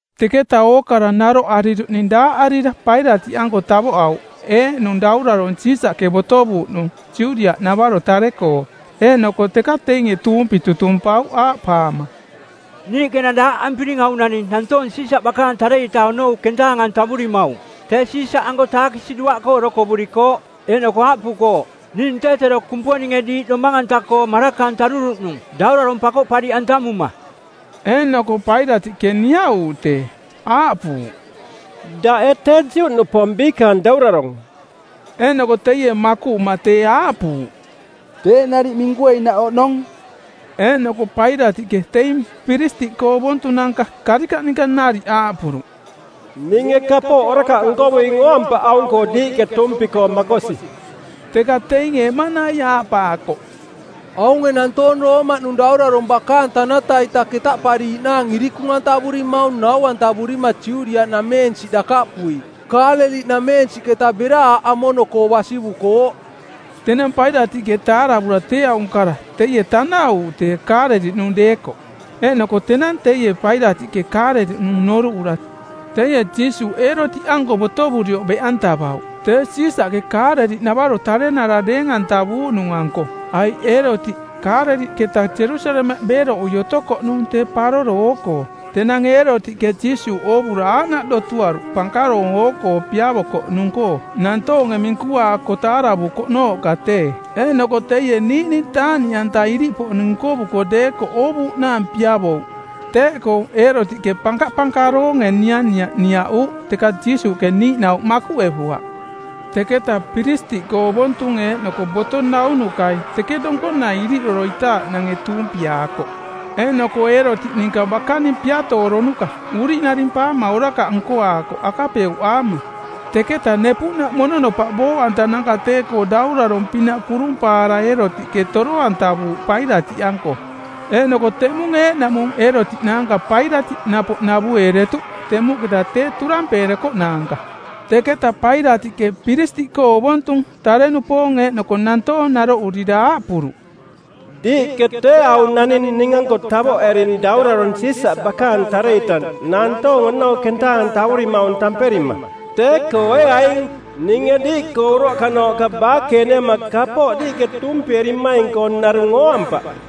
Teketa ookara naroꞌariruꞌning daaꞌarira Pailatiꞌanko tavoꞌauꞌ eeꞌnung daurarong Siisaꞌke botovuuꞌnung Judiaꞌnavaro tare-koo. Eeꞌnoko teka teinge tuumpi tutumpauꞌ aaꞌpaama, “Niiꞌke enang daaꞌampiring aung naning nantoong Siisaꞌ bakaang tare-ita onou kentaang-antavurimaung, tee Siisaꞌanko taakisi duaꞌkoo orokovurikooꞌ, eeꞌnoko aaꞌpukooꞌ, ‘Ning tee tero Kumponinge diiꞌ domang-anta-koo maraka-antaruruꞌnung, daurarong pakoꞌpariꞌantamuma.’” Eeꞌnoko Pailatiꞌke niaꞌuuꞌ tee, aaꞌpuuꞌ, “Daꞌ ee tee Juꞌnupoong biikaang daurarong?” Eeꞌnoko teie makuꞌuma tee aaꞌpuuꞌ, “Teeꞌ nariꞌ minkueinaꞌ oꞌnong.” Eeꞌnoko Pailatiꞌke teing piristiꞌkoo ovontunanka karikaꞌ ninka nariꞌ aaꞌpuruꞌ, “Ninge kapooꞌ orakaꞌ nkovuing ooampaꞌ aung-koo diiꞌke tuumpi-koo makosi.” Teka teinge eꞌmanai aaꞌpaakoꞌ, “Aunge nantoong Roomaꞌnung daurarong bakaang tanata-ita ketaꞌpariiꞌnaang irikung-antavurimaung nau-antavurima Judiaꞌnameensiꞌ dakaꞌpui, Kaaleliꞌnameensiꞌketa bera aaꞌ amono-koo basivukooꞌ.” Tenang Pailatiꞌke taaravura tee aung kara teie tanaꞌuuꞌ tee Kaaleliꞌnung deekoꞌ. Eeꞌnoko tenang teie Pailatiꞌke Kaaleliꞌnung noruꞌura, teie Jiisuuꞌ Eerotiꞌanko botovurioꞌ beꞌantavauꞌ, tee Siisaꞌke Kaaleliꞌnavaro tarenara deeng-antavuuꞌnung-anko, aiꞌ Eerotiꞌ Kaaleliꞌketa Jerusalemaꞌ beeroꞌui otokoꞌnung tee paroro oo-koo. Tenang Eerotiꞌke Jiisuuꞌ oovura aaꞌnaꞌ dotuaruꞌ pankaroong oo-koo piavokoꞌnung-koo nantoonge minkuaako taaravukoꞌnooꞌka tee. Eeꞌnoko teie niiꞌning taaꞌniꞌanta iriꞌpoꞌning nkovuko deekoꞌ oovuuꞌnaang piavouꞌ. Teeꞌkoo Eerotiꞌke pankapankaroonge nianiaꞌ niaꞌuuꞌ, teka Jiisuuꞌke niiꞌnauꞌ makuꞌevuaꞌ. Teketa piristiꞌkoo ovontung eeꞌnoko boto naunukai teke donkonai iriꞌoroitaaꞌnange tuumpiaakoꞌ. Eeꞌnoko Eerotiꞌ ninka bakaning piatooronukai uriꞌnarimpaama orakaꞌ nkoaakoꞌ akapeuꞌaama, teketa nepuꞌnaꞌ mononopaꞌ booꞌantananka tee-koo daurarong-pinaꞌ kurumpaara Eerotiꞌke toro-antavuuꞌ Pailatiꞌanko. Eeꞌnoko teꞌmung eeꞌnaꞌmung Eerotiꞌ naanka Pailatiꞌ napoꞌ navueeretuꞌ temuꞌketa tee turampeerekoꞌnaanka. Teketa Pailatiꞌke piristiꞌkoo ovontung, tare-nupoong eeꞌnoko nantoong naroꞌurira aaꞌpuruꞌ, “Diiꞌke tee aung naning ning-anko tavoꞌering daurarong Siisaꞌ bakaang tare-ita nantoong onou kentaang-antavurimaung tamperima. Tee-koo ee aing, ninge diiꞌkoo uroꞌkanooꞌka baakeeneama kapooꞌ diiꞌke tuumpierimaing-koo narung ooampaꞌ.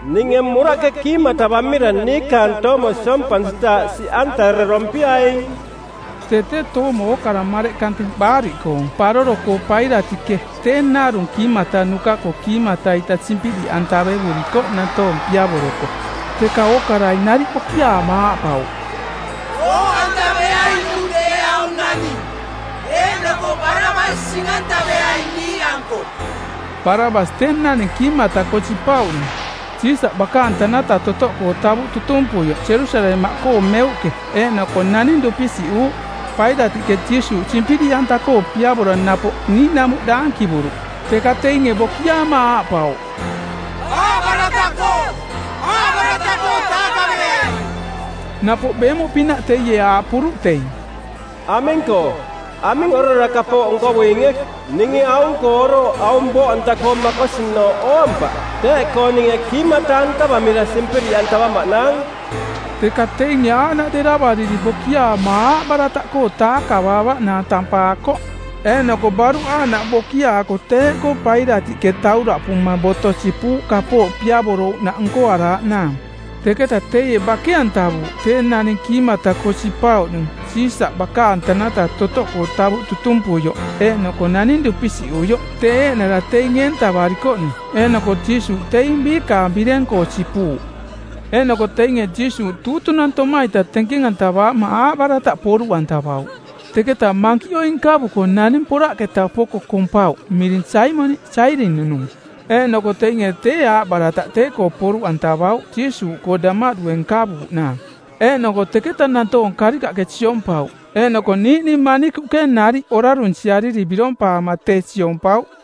Ninge muraꞌke kiimata-antavamira niikaang toomo siompansitaaꞌ siꞌantarerompiaing.” Tee tee toomo ookara mareꞌ kante Baariꞌkoong˜ Paroro-koo Pailatiꞌke tee narung kiimatanuka-koo kiimata-ita simpiriꞌantaevurikoꞌ nantoong piavoroko. Teka ookarai nariꞌ bokiaama aaꞌpauꞌ, “Booꞌantaveainung tee aung naning, eeꞌnoko Barabas sing-antaveai niiꞌanko.” Barabas tee naning kiimata-koo sipauꞌnung Siisaꞌ bakaang tanata totoꞌkoo tavuꞌ tutumpuioꞌ Jerusalemaꞌkoo meuꞌke eeꞌnoko naning dupisiꞌuuꞌ. Pailatiꞌke Jiisuuꞌ simpiriꞌanta-koo piavora napoꞌ niiꞌnamuꞌ daankivuruꞌ, teka teinge bokiaama aaꞌpauꞌ, “Aaꞌbarataꞌkoo, aaꞌbarataꞌkoo taakaveai!” Napoꞌ beemuꞌpinaꞌ teie aaꞌpuruꞌ teing, “Aming-koo? Aming orara kapooꞌ nkovuinge? Ninge aung-koo orooꞌ aung booꞌanta-koo makosinooꞌ ooampaꞌ. Teeꞌkoo ninge kiimata-antavamira simpiriꞌantavamaꞌnaang.” Teka teinge aaꞌnaꞌ deravariri bokiaama aaꞌbarataꞌkoo taakavaavaꞌnaang tampaakoꞌ. Eeꞌnoko baruꞌ aaꞌnaꞌ bokiaako teeꞌkoo Pailatiꞌke tauraꞌpuma boto sipuuꞌ kapooꞌ piavorouꞌnaꞌ nkoaraaꞌnaang. Teketa teie bake-antavuuꞌ tee naning kiimata-koo sipauꞌnung Siisaꞌ bakaang tanata totoꞌkoo tavuꞌ tutumpuioꞌ eeꞌnoko naning dupisiꞌuioꞌ, tee eeꞌnara teing eentavaarikoꞌnung, eeꞌnoko Jiisuuꞌ teing biikaang bireng-koo sipuuꞌ. Eeꞌnoko teinge Jiisuuꞌ tuutunantoma-ita tenkeng-antavaama aaꞌbarataꞌ poruꞌantavauꞌ. Teketa mankiꞌoi nkavuko naning poraꞌketa poko kompauꞌ miring Saimoniꞌ, Sairini-nung, eeꞌnoko teinge tee aaꞌbarataꞌ tee-koo poruꞌantavauꞌ Jiisuuꞌkoo damaꞌdue nkavuuꞌnaang. Eeꞌnoko teketa nantoong karikaꞌke siompauꞌ, eeꞌnoko niiꞌning manikuꞌke nariꞌ orarunsiariri birompaama tee siompauꞌ.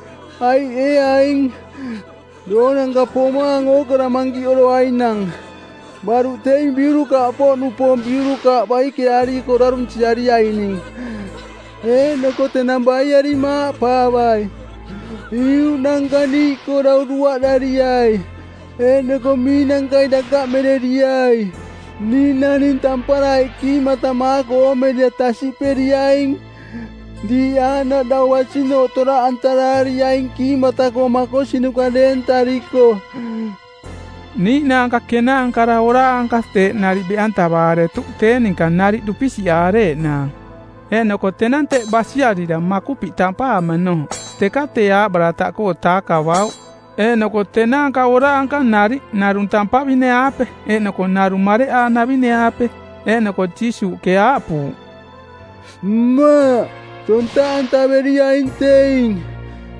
Aiꞌ, ee aing, doonanka pomaang ookara mankiꞌoroainang, baruꞌ teing biurukaaꞌpoꞌnupoong biurukaaꞌ baikeaariko orarunsiariaining. Eeꞌnoko tenang baiarima aaꞌpaavai, ‘Iuꞌnanka niiꞌkoo dau duaꞌdariai eeꞌnoko miinankai dakaꞌmereriai.’ Ning naning tampara eeꞌ kiimatamaako oomerira tasiꞌperiaing diiꞌ aaꞌnaꞌ dau basinooꞌ toraꞌantaraariaing kiimata-koo makosinuka deentariko.” Niiꞌnaanka kenaankara oraanka teeꞌ nariꞌ beꞌantavaaretuꞌ tee ninka nariꞌ dupisiꞌaareeꞌnaang. Eeꞌnoko tenang teꞌ basiarira Makupiꞌ tampaamanooꞌ teka tee aaꞌbarataꞌkoo taakavauꞌ, eeꞌnoko tenaanka oraanka nariꞌ, narung tampavine-aape eeꞌnoko narung mareꞌaanavine-aape. Eeꞌnoko Jiisuuꞌke aaꞌpuuꞌ, “Mmaꞌ tontaꞌantaveriaing teing,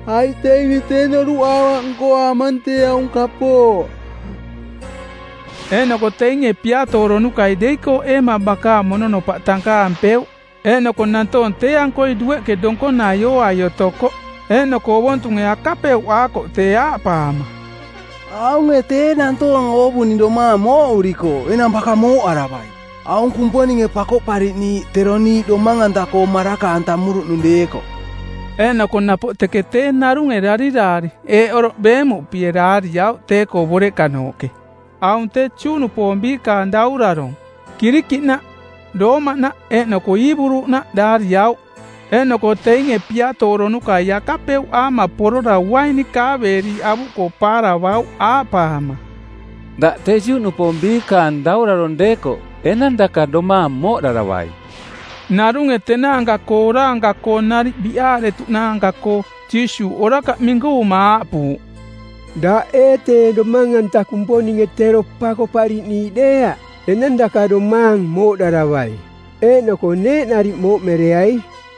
aiꞌ teinge tee noruꞌaavaꞌ nkoaamang tee aung kapooꞌ.” Eeꞌnoko teinge piatooronukai deikooꞌeema bakaang mononopaꞌ tankaampeuꞌ. Eeꞌnoko nantoong tee-ankoi dueꞌke donkonai ooai otokoꞌ, eeꞌnoko ovontunge akapeuꞌaakoꞌ tee aaꞌpaama, “Aunge tee nantoong oovuning domaang mooꞌurikooꞌ, enang baka mooꞌaravai, aung Kumponinge Pakoꞌpariꞌniiꞌ, tero niiꞌ domang-anta-koo maraka-antamuruꞌnung deekoꞌ.” Eeꞌnoko napoꞌ teke tee narunge dariraari eeꞌ oroꞌ beemuꞌpie daariauꞌ tee-koo boreꞌkanooꞌke: AUNG TEE JUꞌNUPOONG BIIKAANG DAURARONG; Kirikiꞌnaꞌ, Roomaꞌnaꞌ eeꞌnoko Iiburunaꞌ daariauꞌ; Eeꞌnoko teinge piatooronukai akapeuꞌaama porora uaini kaaveeriiꞌ avuꞌkoo paaravauꞌ aaꞌpaama, “Daꞌ tee Juꞌnupoong Biikaang Daurarong deekoꞌ enang daka domaang mooꞌdaravai.” Narunge tenaanka-koo oraanka-koo nariꞌ biꞌaaretuꞌnaanka-koo Jiisuuꞌ orakaꞌ minkuvuma aaꞌpuuꞌ, “Daꞌ ee tee Domang-anta Kumponinge tero Pakoꞌpariꞌniiꞌ deeaꞌ? Enang daka domaang mooꞌdaravai, eeꞌnoko neeꞌ nariꞌ mooꞌmereai.”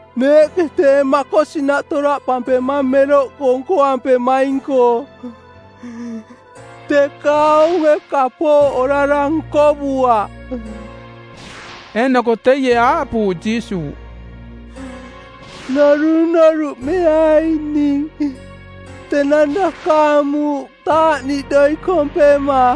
Neeꞌke tee makosinaꞌ toraꞌpampemang meroꞌkoo nkoampemaing-koo, teka aunge kapooꞌ orara nkovuaꞌ.” Eeꞌnoko teie aaꞌpuuꞌ Jiisuuꞌ, “Norunoruꞌmeai ning tenang dakaang muuꞌ taaꞌniꞌdoi kompema.”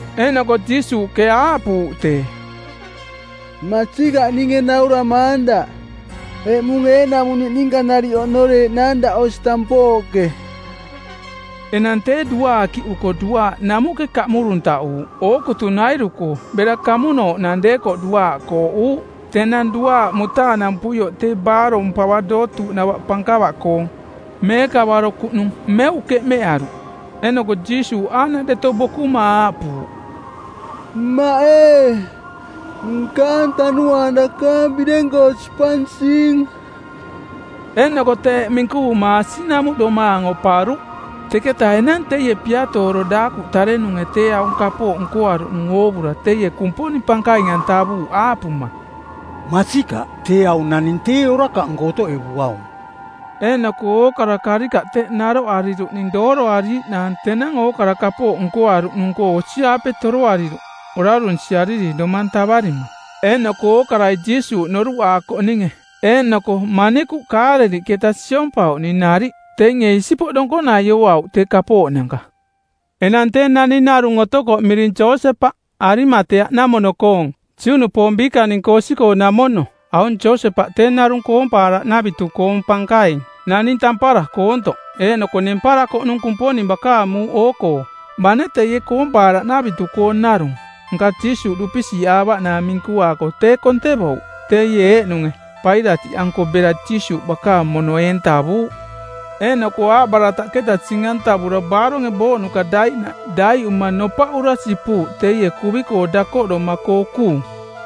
Eeꞌnoko Jiisuuꞌke aaꞌpuuꞌ tee, “Masikaꞌ ninge nauramaang daꞌ, eꞌmung eeꞌnaꞌmung niꞌninka nariꞌ oꞌnoreeꞌnaang daꞌ osi tampooꞌke˜.” Enang tee duaakiꞌuko duaaꞌ namuꞌke kaꞌmuruntaꞌuuꞌ ookutunairu-koo bera kamunooꞌnang deekoꞌ duaaꞌ kooꞌuuꞌ. Tenang duaaꞌ mutaanampuioꞌ tee baarong pava dootuuꞌnava pankava-koong, meekavaro kuꞌnung, meuꞌ keꞌmeꞌaruꞌ. Eeꞌnoko Jiisuuꞌ aaꞌnaꞌ deto bokuma aaꞌpuuꞌ, “Mmaꞌ ee, nkaang tanuaang dakaang bireng-koo sipansing.” Eeꞌnoko teeꞌ minkuvuma asiꞌnamuꞌ domaang oparuꞌ. Teketa enang teie piatooro daakuꞌ tarenunge tee aung kapooꞌ nkoaruꞌnung oovura teie Kumponing pankaing-antavuuꞌ aaꞌpuma, “Masikaꞌ, tee aung naning tee orakaꞌnko otoꞌevuaung.” Eeꞌnoko ookara karikaꞌ teꞌ naroꞌariruꞌning dooroariiꞌnaang tenang ookara kapooꞌ nkoaruꞌnung-koo osi-aape toroariruꞌ orarunsiariri domang tavarima. Eeꞌnoko ookarai Jiisuuꞌ noruꞌaakoꞌninge, eeꞌnoko manikuꞌ Kaaleliꞌketa siompauꞌning nariꞌ, teinge isipoꞌ donkonai ooauꞌ tee kapooꞌnanka. Enang tee naning narung otokoꞌ miring Josepaꞌ, Arimateaꞌnamono-koong, Juꞌnupoong biikaning-koo osi-koo namono. Aung Josepaꞌ tee narung koompaaraꞌnavitu-koong pankaing, naning tampara, koontoꞌ, eeꞌnoko nemparakoꞌnung Kumponing bakaang muuꞌ oo-koo; Bane teie koompaaraꞌnavitu-koong narung, nka Jiisuuꞌ dupisiꞌaavaꞌnaang minkuaako tee kontevouꞌ. Teie eeꞌnunge Pailatiꞌanko bera Jiisuuꞌ bakaang mono eentavuuꞌ. Eeꞌnoko aaꞌbarataꞌketa sing-antavura baaronge booꞌnuka daiꞌnaꞌ daiꞌuma nopaꞌura sipuuꞌ teie kuvi dakoꞌdoma-koo kuung,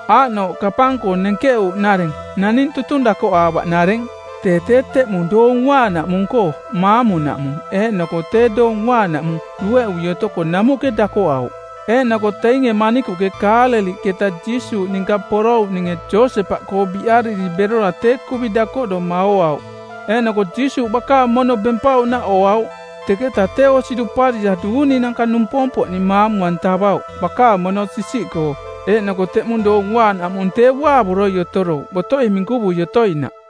aaꞌnooꞌ kapang-koo nenkeꞌuuꞌnareng, naning tutung dakoꞌaavaꞌnareng. Tee tee teꞌmung Doong Uaanaꞌmung-koo maamunaꞌmung eeꞌnoko tee Doong Uaanaꞌmung dueꞌui otoko namuꞌke dakoꞌauꞌ. Eeꞌnoko teinge manikuꞌke Kaaleliꞌketa Jiisuuꞌ ninka porouꞌninge Josepaꞌkoo biꞌariri berora tee kuvi dakoꞌdoma ooauꞌ eeꞌnoko Jiisuuꞌ bakaang mono bempauꞌnaꞌ ooauꞌ. Teketa tee osi duparira duuninanka numpompoꞌning maamu-antavauꞌ bakaang mono sisiꞌkoo, eeꞌnoko teꞌmung Doong Uaanaꞌmung tee uaavoroi otorouꞌ botoi minkuvui otoinaꞌ.